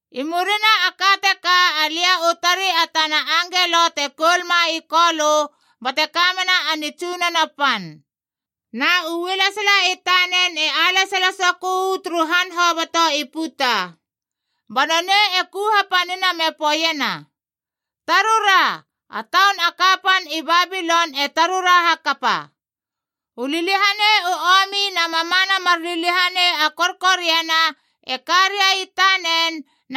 I murina a ka teka alia u tarei a tana angelo te koulma i Kolö bate ka mena a nitsunono pan. Na u ualesala i tanen e alesala sokö uu turu han hoboto i puta. Ba nonei e ku hapanina me poeiena: “Tarura! A taun a kapan i Babilon e tarura hakapa! U liliahanei u omi na mamana mar liliahanei a korkoriana e ka ria i tanen,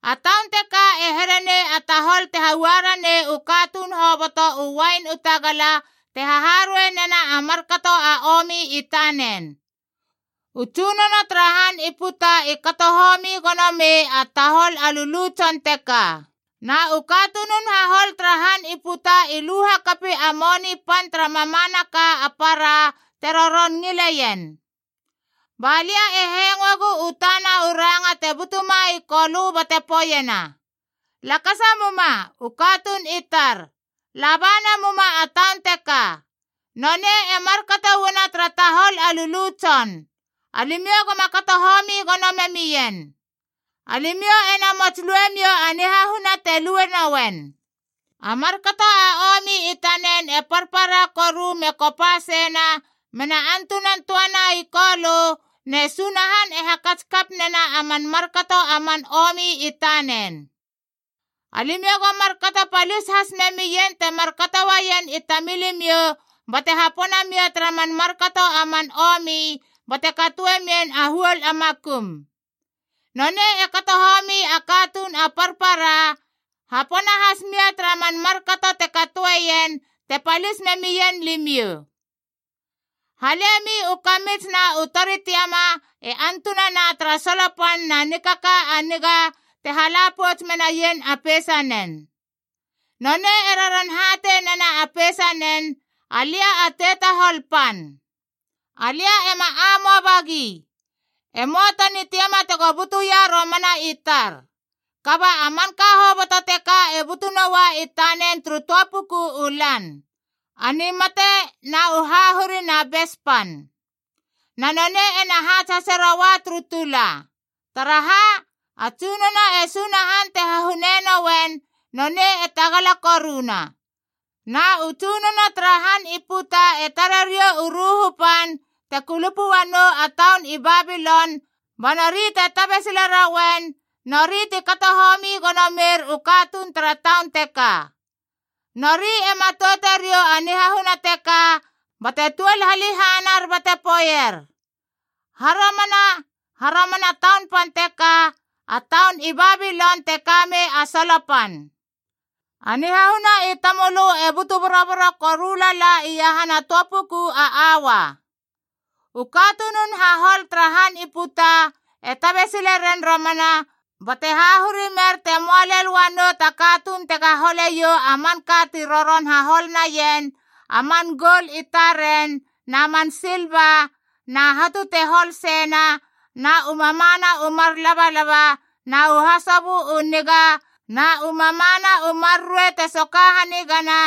A taun teka e here nei a tahol te haua ranei u katuun hoboto u uain u tagala te haharuei nena a markato a omi i tanen. U tsunono tara han i puta i kato homi gono mei a tahol a lulu tson teka. Na u katunun hahol tara han i puta i lu hakapi a moni pan tara mamanaka a para te roron ngileien.” Ba lia e hengoegu u tana u ranga te butuma i Kolö bate poeiena: “Lakasa muma, u katuun i tar! La ba namuma a taun teka! Nonei e markato uana tara tahol a lulu tson. Alimiou goma kato homi gono memien. Alimiou e namots lue miou a nihahuna te lue nouen. A markato a omi i tanen e parpara koru me kopa seina mena antunan töana i Kolö, ne Sunahan e hakats kap nena a man markato a man omi i tanen. Alimiou go markato palis has memien te markato uaien i tamilimiou bate hapona mia tara man markato a man omi, bate katoe mien a huol a makum. Nonei e kato homi a katuun a parpara, hapona has mia tara man markato te katoeien te palis memien limiou. Halemi u kamits na u tori tiama e antunana tara solo pan na nikaka a niga te hala pouts menaien a peisanen. Nonei e roron hatei nena a peisanen, ‘Alia a tetahol pan. Alia ema amoaba gi. E möa ta nitiama tego butuia romana i tar.’ Kaba a manka hoboto teka e butu noua i tanen turu töa puku u lan: a nimate na u hahuri na bes pan. Na nonei ena haats hase roua turu tula. Taraha? A Tsunono e Sunahan te hahune nouen, nonei e tagala koruna. “Na u tsunono tara han i puta e tare riou u ruhu pan te kulupu uanou a taun i Babilon ba nori te tabe sile rouen, nori ti kato homi gono meir u katuun tara taun teka. Nori e matoute riou a nihahuna teka bate tuol halehanar bate poeier: ‘Haromana, haromana taun pan teka, a taun i Babilon te ka mei a solo pan. A nihahuna i tamölö e butu boroboro koru lala iahana töa puku a aua!’ “U katunun hahol tara han i puta e tabe sile ren romana bate hahuri mer te möa lel uanou ta katuun tega hole iou a manka ti roron hahol naien, a man goul i taren na man silva na hatu te hol seina na u mamana u mar labalaba na u hasobö u niga, na u mamana u mar ruei te soka hanigana,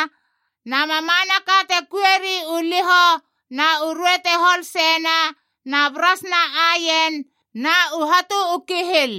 na mamanaka te kuieri u lihoc na u ruei te hol seina na bras na aien na u hatu u kihil.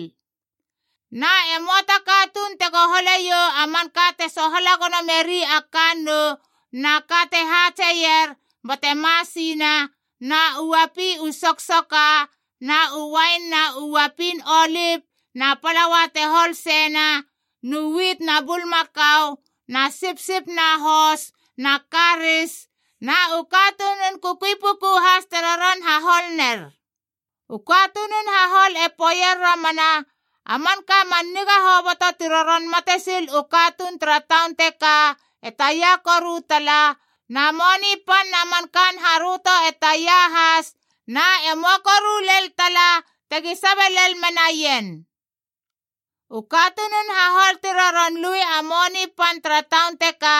Na e möa ta katuun tego hole iou a man ka te sohala gono meri a kannoud na ka te haatseier bate masinae na u uapi u soksoka, nu uain na u uapin olip na palaua te hol seinaf nu wit na bulmakau na sipsip na hos na karis, na u katunun kukui pukug has te roron hahol ner. “U katunun hahol e poeier romana, ‘A manka man niga hoboto ti roron matesil u katuun tara taun teka e taia koru tala, na moni pan na man kaan haröto e taia has, na e möa koru lel tala tegi sabe lel menaien!’ U katunun hahol ti roron lui a moni pan tara taun teka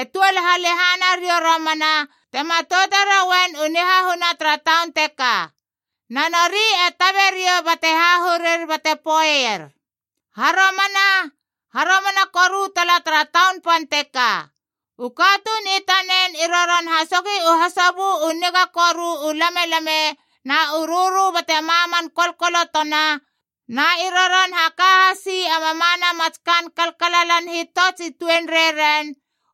e tuol halehana riou romana te matoute roien u nihahuna tara taun teka. Na nori e tabe riou bate hahurir bate poeier, ‘Haromana, haromana koru tala tara taun pan teka! U katuun i tanen i roron hasogi u hasobö u niga koru u lamelame na u rörö bate maman kolkolotona, na i roron haka hasi a mamana mats kaan kalalan hitots i tuenreiren,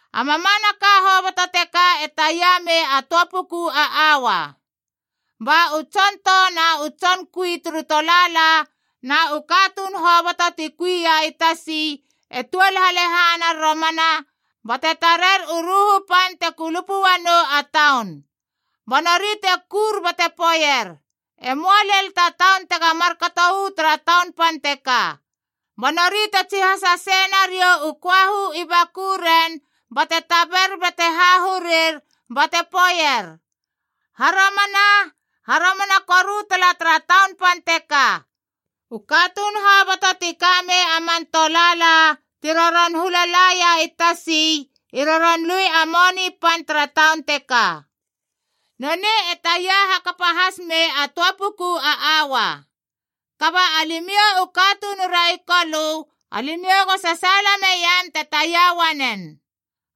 A mamanaka hoboto teka e taia mei a töa puku a aua!’ “Ba u tson tou na u tson kui turu tolaala na u katuun hoboto ti kui ia i tasi e tuol halehanar romana bate tarer u ruhu pan te kulupu uanou a taun. Ba nori te kur bate poeier, ‘E möa lel ta taun tega markato uu tara taun pan teka!’ Ba nori te tsihasa sei nariou u köahu i bakuren bate taber bate hahurir bate poeier: ‘Haromana, haromana koru tala tara taun pan teka! U katuun hoboto ti kamei a man tolaala ti roron hula laia i tasi i roron lui a moni pan tara taun teka. Nonei e taia hakapa has mei a töa puku aua!’ Kaba alimiou u katunura i Kolö, alimiou go sasaala meiam te taia uanen.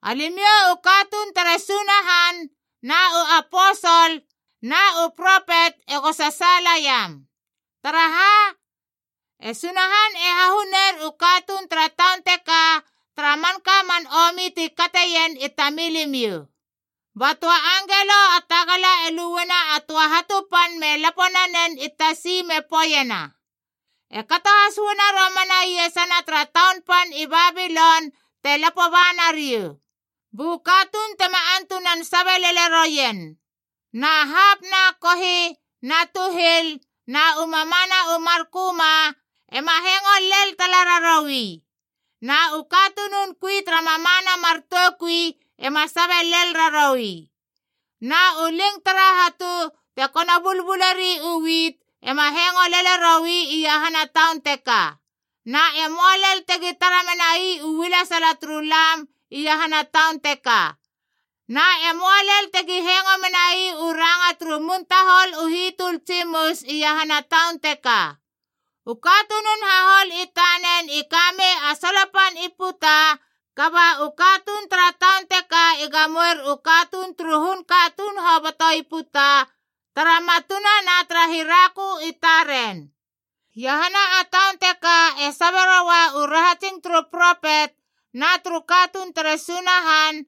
Alimiou u katuun tere Sunahan na u aposol na u propet ego sasaala iam. Taraha? E Sunahan e hahuner u katuun tara taun teka tara manka man omi ti kateien i tamilimiou!” Ba töa angelo a tagala e luena a töa hatu pan me lapo nanen i tasi me poeiena: “E kato has uana romana iesana tara taun pan i Babilon te lapo ba nariou, bu katuun tema antunan sabe lele roien. Na hapi na kohi na tuhil na u mamana u mar köma ema hengo lel tala raroui, na u katunun kui tara mamana mar toukui ema sabe lel raroui, na u ling tara hatu te kono bulbuleri u wit ema hengo lele roi iahana taun teka. Na e möa lel tegi tara menai u ualesala turu lam iahana taun teka. Na e möa lel tegi hengo menai u ranga turu mun tahol u hitöl tsimus iahana taun teka. U katunun hahol i tanen i ka mei a solo pan i puta, kaba u katuun tara taun teka i gamoer u katuun turu hun katuun hoboto i puta tara matuna na tara hirakö i taren. Iahana a taun teka e sabe roua u rahatsing turu propet na turu katuun tere Sunahan